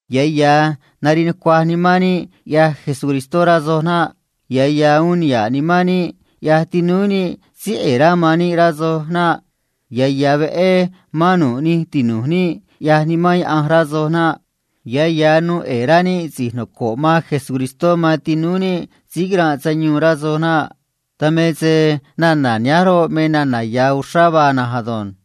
Ya̱ ya̱ nariꞌ nucuaj nimán níꞌ, ꞌyaj Jesucristó, rá soj naꞌ. Ya̱ ya̱ uun niha̱ꞌ nimán níꞌ, ꞌyaj tinúú níꞌ síí ꞌe̱e̱ rá man níꞌ, rá soj naꞌ. Ya̱ ya̱ veꞌé mán nu̱ꞌ nij tinu̱j níꞌ, ꞌyaj Nimán Diose̱, rá soj naꞌ. Ya̱ ya̱ nuu ꞌe̱e̱ rá níꞌ si̱j noco̱ꞌ man Jesucristó man tinúú níꞌ síí quiranꞌ sayuun, rá soj naꞌ. Dan me se nana̱ nihánj roꞌ, me ya̱ uxrá vaa na̱nj ado̱nj.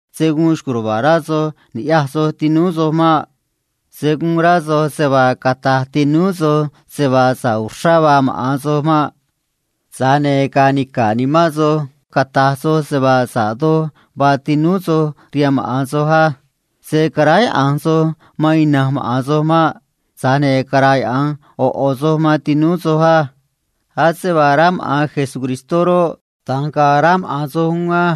Se̱ guun xco̱j ruva̱a̱ rá soj ni̱ꞌyaj soj tinúú soj maꞌ. Se̱ guun rá soj se vaa cata̱j tinúú soj se vaa sa̱ꞌ uxrá vaa maꞌa̱n soj maꞌ. Tza̱j ne̱ ga̱a̱ nica̱ꞌ nimán soj, cata̱j soj se vaa sa̱ꞌ doj vaa tinúú soj rihaan maꞌa̱n soj á. Se̱ caráyaꞌa̱nj soj man ina̱nj maꞌa̱n soj maꞌ. Tza̱j ne̱ cara̱yaꞌa̱nj ꞌo̱ ꞌo̱ soj man tinúú soj á. Ase vaa rá maꞌa̱n Jesucristó roꞌ, da̱nj ga̱a̱ rá maꞌa̱n soj uún á.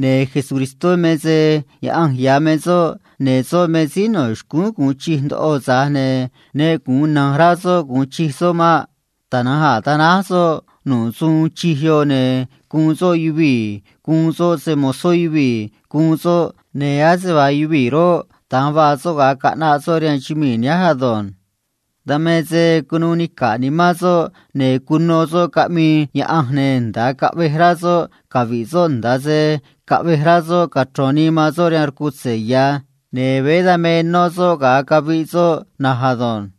Ne̱ Jesucristó me se Diose̱ ya̱ me soꞌ, ne̱ soꞌ me síí no̱ xcúún gu̱un chij ndoꞌo, tza̱j ne̱ ne gu̱un niha̱ꞌ ndoꞌo rá soꞌ gu̱un chij soꞌ maꞌ. Tana̱nj a̱ tanáj soꞌ nu̱ꞌ suun uun chij yoꞌ, ne̱ guun soꞌ yuvii̱ guun soꞌ se‑mo̱zó yuvii̱ guun soꞌ, ne̱ ase vaa yuvii̱ roꞌ, da̱nj vaa soꞌ ga̱a caꞌnaꞌ soꞌ rihaan chumii̱ nihánj ado̱nj. Dan me se cunuu nica̱ꞌ nimán soꞌ, ne̱ cuno soꞌ caꞌmii Diose̱, ne̱ nda̱a caꞌvej rá soꞌ cachro̱n nii man soꞌ rihaan rcutze̱ ya̱, ne̱ veé da̱nj me nó soꞌ ga̱a caviꞌ soꞌ na̱nj ado̱nj.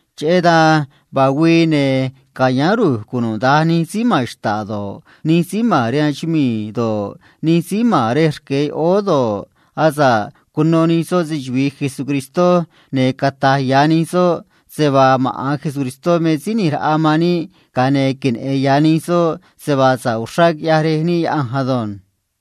Cheꞌé dan vaa güii, ne̱ canicu̱nꞌ ru̱j cunuda̱nj nij síí ma̱n xta̱ꞌ do̱ꞌ, nij síí ma̱n rihaan chumii̱ do̱ꞌ, nij síí ma̱n rej rque yoꞌóó do̱ꞌ, asa̱ꞌ cuno nij soꞌ se‑chuvi̱i Jesucristó, ne̱ cata̱j ya̱ nij soꞌ se vaa maꞌa̱n Jesucristó me síí ꞌni̱j raꞌa man níꞌ, ne̱ queneꞌe̱n nij soꞌ se vaa sa̱ꞌ uxrá quiꞌyaj Rej níꞌ Diose̱ ado̱nj.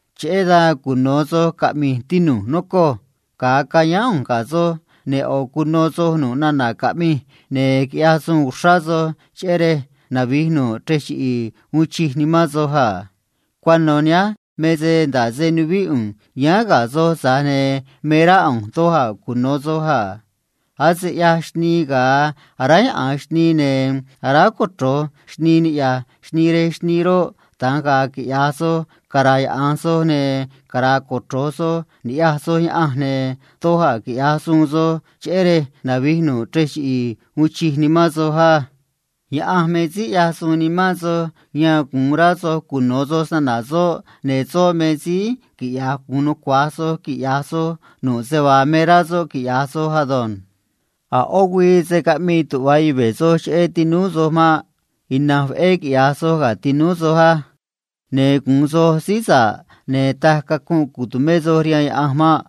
Cheꞌé dan cuno̱ soj caꞌmi̱j, tinu̱j, nocoj. Ga̱a cayáán ꞌu̱nj ga̱ soj, ne̱ cuno soj nu̱ꞌ nana̱ caꞌmij, ne̱ quiꞌyaj suun uxrá soj cheꞌé rej quinavi̱j nu̱ꞌ chrej chiꞌi̱i̱ uun chij nimán soj, ne̱ cunu̱u sa̱ꞌ nimán soj a. Cuano̱ nihánj me se nda̱ꞌ se nuvíꞌ ꞌu̱nj yáán ga̱ soj, tza̱j ne̱ me rá ꞌu̱nj doj cuno̱ soj a. Ase ꞌyaj xnii ga̱a chuꞌviꞌ xnii niꞌya̱j xnii rej xnii roꞌ, da̱nj ga̱a̱ quiꞌya̱j soj cuchuꞌvi̱ꞌ soj ni̱ꞌyaj soj Diose̱, ne̱ doj a̱ quiꞌya̱j suun soj cheꞌé rej quinavi̱j nu̱ꞌ chrej chiꞌi̱i̱ uun chij nimán soj, ne̱ cunu̱u sa̱ꞌ nimán soj rihaan Diose̱ á. Diose̱ me síí ꞌyaj suun nimán soj yan gu̱un rá soj cuno̱ soj se‑na̱na̱ soꞌ, ne̱ soꞌ me síí quiꞌya̱j gu̱un nucua̱j soj quiꞌya̱j soj nu̱ꞌ se vaa me rá soꞌ quiꞌya̱j soj ado̱nj. A̱ ꞌó güii se̱ caꞌmii tuꞌva yuve̱ soj cheꞌé tinúú soj maꞌ. Ina̱nj veꞌé quiꞌya̱j suun soj ga̱ tinúú soj á. Ne̱ gu̱un soj síí sa̱ꞌ, ne̱ taj cacunꞌ cu̱tumé soj rihaan Diose̱ mei.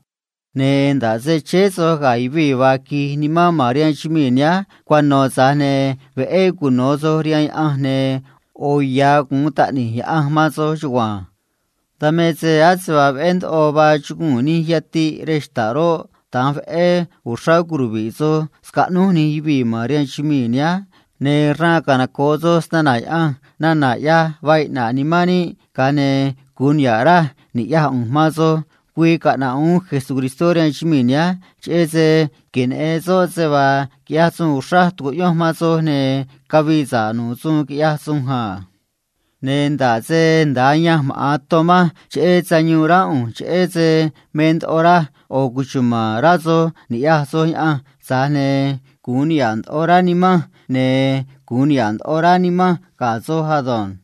Ne̱ nda̱ꞌ se chéé soj ga̱ yuvii̱ vaa quij nimán ma̱n rihaan chumii̱ nihánj cuano̱, tza̱j ne̱ veꞌé cuno̱ soj rihaan Diose̱, ne̱ yoꞌo̱ ya̱ gu̱un taꞌni̱j Diose̱ man soj chugua̱nj. Dan me se ase vaa veꞌé ndoꞌo vaa chuguu̱n yatiꞌ rej xta̱ꞌ roꞌ, da̱nj veꞌé uxrá queneꞌe̱n yuvii̱ man soj va̱j soj rihaan chumii̱ nihánj, ne̱ raan canoco̱ꞌ soj se‑na̱na̱ Diose̱ nana̱ ꞌyaj vaa iꞌna̱ꞌ nimán níꞌ, ga̱a ne̱ gu̱un niha̱ꞌ raj ni̱ꞌyaj ꞌu̱nj man soj ga̱a güii caꞌna̱ꞌ uún Jesucristó rihaan chumii̱ nihánj, cheꞌé se queneꞌe̱n soꞌ se vaa quiꞌyaj suun uxraj tucuꞌyonj man soj ne̱ cavii sa̱ꞌ nu̱ꞌ suun quiꞌyaj sunj a. Ne̱ nda̱ꞌ se nda̱a ayanj maꞌa̱n ton manj cheꞌé sayuun ránꞌ ꞌu̱nj cheꞌé se me ndoꞌo raj yoꞌo̱ cuchuma̱n rá soj ni̱ꞌyaj soj Diose̱, tza̱j ne̱ gu̱un niha̱ꞌ ndoꞌo raj, ne̱ tu̱cuachenj do̱j se niha̱ꞌ nu̱u̱ nimanj nimán soj ei.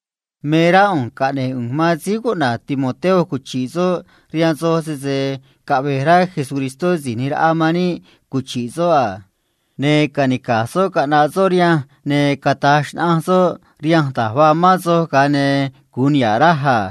Me rá ꞌu̱nj caꞌne̱j ꞌu̱nj man síí cuꞌna̱j Timoteo cuchi̱ꞌ soꞌ rihaan soj, sese caꞌve̱j rá Jesucristó si̱j ꞌni̱j raꞌa man níꞌ cuchi̱ꞌ soꞌ a. Ne̱ ca̱nica̱j soꞌ caꞌna̱ꞌ soꞌ rihanj, ne̱ cata̱j xnaꞌanj soꞌ rihanj da̱j quiranꞌ soj, ga̱a ne̱ gu̱un niha̱ꞌ raj a.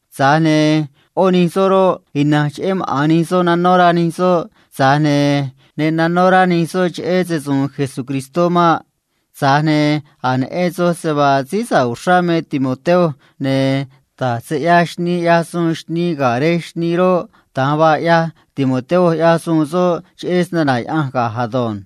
Tza̱j ne̱ yoꞌó nij soꞌ roꞌ, ina̱nj cheꞌé maꞌa̱n nij soꞌ aráyaꞌa̱nj nij soꞌ, tza̱j ne̱ ne aráyaꞌa̱nj nij soꞌ cheꞌé Jesucristó maꞌ. Tza̱j ne̱ a̱j neꞌen soj se vaa síí sa̱ꞌ uxrá me síí cuꞌna̱j Timoteo, ne̱ da̱j se ꞌyaj xnii ꞌyaj suun xnii ga̱ rej xnii roꞌ, da̱nj vaa ꞌyaj Timoteo ꞌyaj suun soꞌ cheꞌé se‑na̱na̱ Diose̱ ga̱j ei.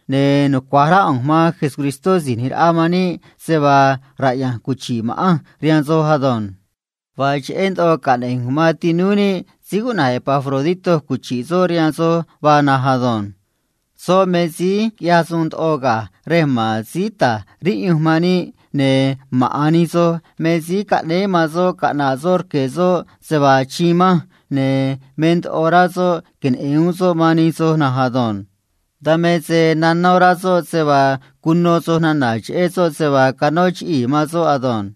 Ne̱ nucua̱j rá ꞌu̱nj man síí ꞌni̱j raꞌa man níꞌ se vaa raꞌya̱nj cuchi̱ꞌ ma̱ꞌanj rihaan soj ado̱nj. Vaa cheꞌé ndoꞌo caꞌne̱j ꞌu̱nj man tinúú níꞌ síí cuꞌna̱j Epafrodito cuchi̱ꞌ soꞌ rihaan soj vaa na̱nj ei. Soꞌ me síí quiꞌyaj suun ndoꞌo ga̱j rej ma̱n síí ta̱j riꞌyunj man níꞌ, ne̱ maꞌa̱n nij soj me síí caꞌnéé man soꞌ caꞌna̱ꞌ soꞌ rque̱ soꞌ se vaa achiin manj, ne̱ me ndoꞌo rá soꞌ queneꞌe̱n uún soꞌ man nij soj na̱nj ado̱nj. Dan me se nanó rá soꞌ se vaa cuno soj nana̱ cheꞌé soꞌ se vaa canó chiꞌii̱ man soꞌ ado̱nj.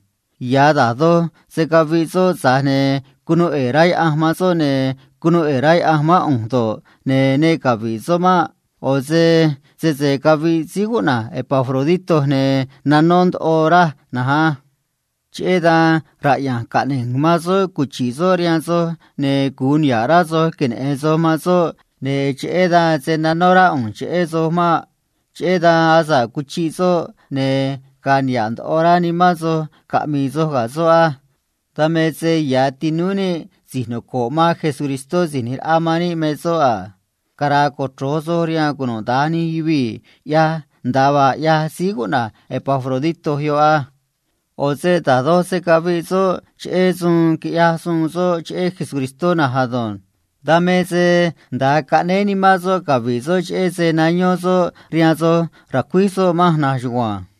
Ya̱ da̱j doj se caviꞌ soꞌ, tza̱j ne̱ cunuu ꞌe̱e̱ rá Diose̱ man soꞌ, ne̱ cunuu ꞌe̱e̱ rá Diose̱ mán ꞌu̱nj do̱ꞌ, ne̱ ne cavi̱ꞌ soꞌ maꞌ. ꞌO̱ se sese caviꞌ síí cuꞌna̱j Epafrodito, ne̱ nanó ndoꞌo raj na̱nj ei. Cheꞌé dan raꞌya̱nj caꞌne̱j ꞌu̱nj man soꞌ cuchi̱ꞌ soꞌ rihaan soj, ne̱ gu̱un niha̱ꞌ rá soj queneꞌe̱n soj man soꞌ, ne̱ cheꞌé dan se̱ nanó rá ꞌu̱nj cheꞌé soj maꞌ. Cheꞌé dan asa̱ꞌ cuchiꞌ soꞌ, ne̱ ga̱a̱ niha̱ꞌ ndoꞌo rá soj caꞌmi̱i̱ soj ga̱ soꞌ ei. Dan me se ya̱ tinúú níꞌ si̱j noco̱ꞌ man síí ꞌni̱j raꞌa man níꞌ me soꞌ ei. Cara̱a̱ cochro̱j soj rihaan cunuda̱nj nij yuvii̱ ꞌyaj nda̱a vaa ꞌyaj síí cuꞌna̱j Epafrodito yoꞌ ei. ꞌO̱ se da̱j doj se caviꞌ soꞌ cheꞌé suun quiꞌyaj suun soꞌ cheꞌé Jesucristó na̱nj ado̱nj. Dan me se caꞌnéé nimán soꞌ cavi̱ꞌ soꞌ cheꞌé se nayón soꞌ rihaan soj racuíj soꞌ manj na̱nj chugua̱nj.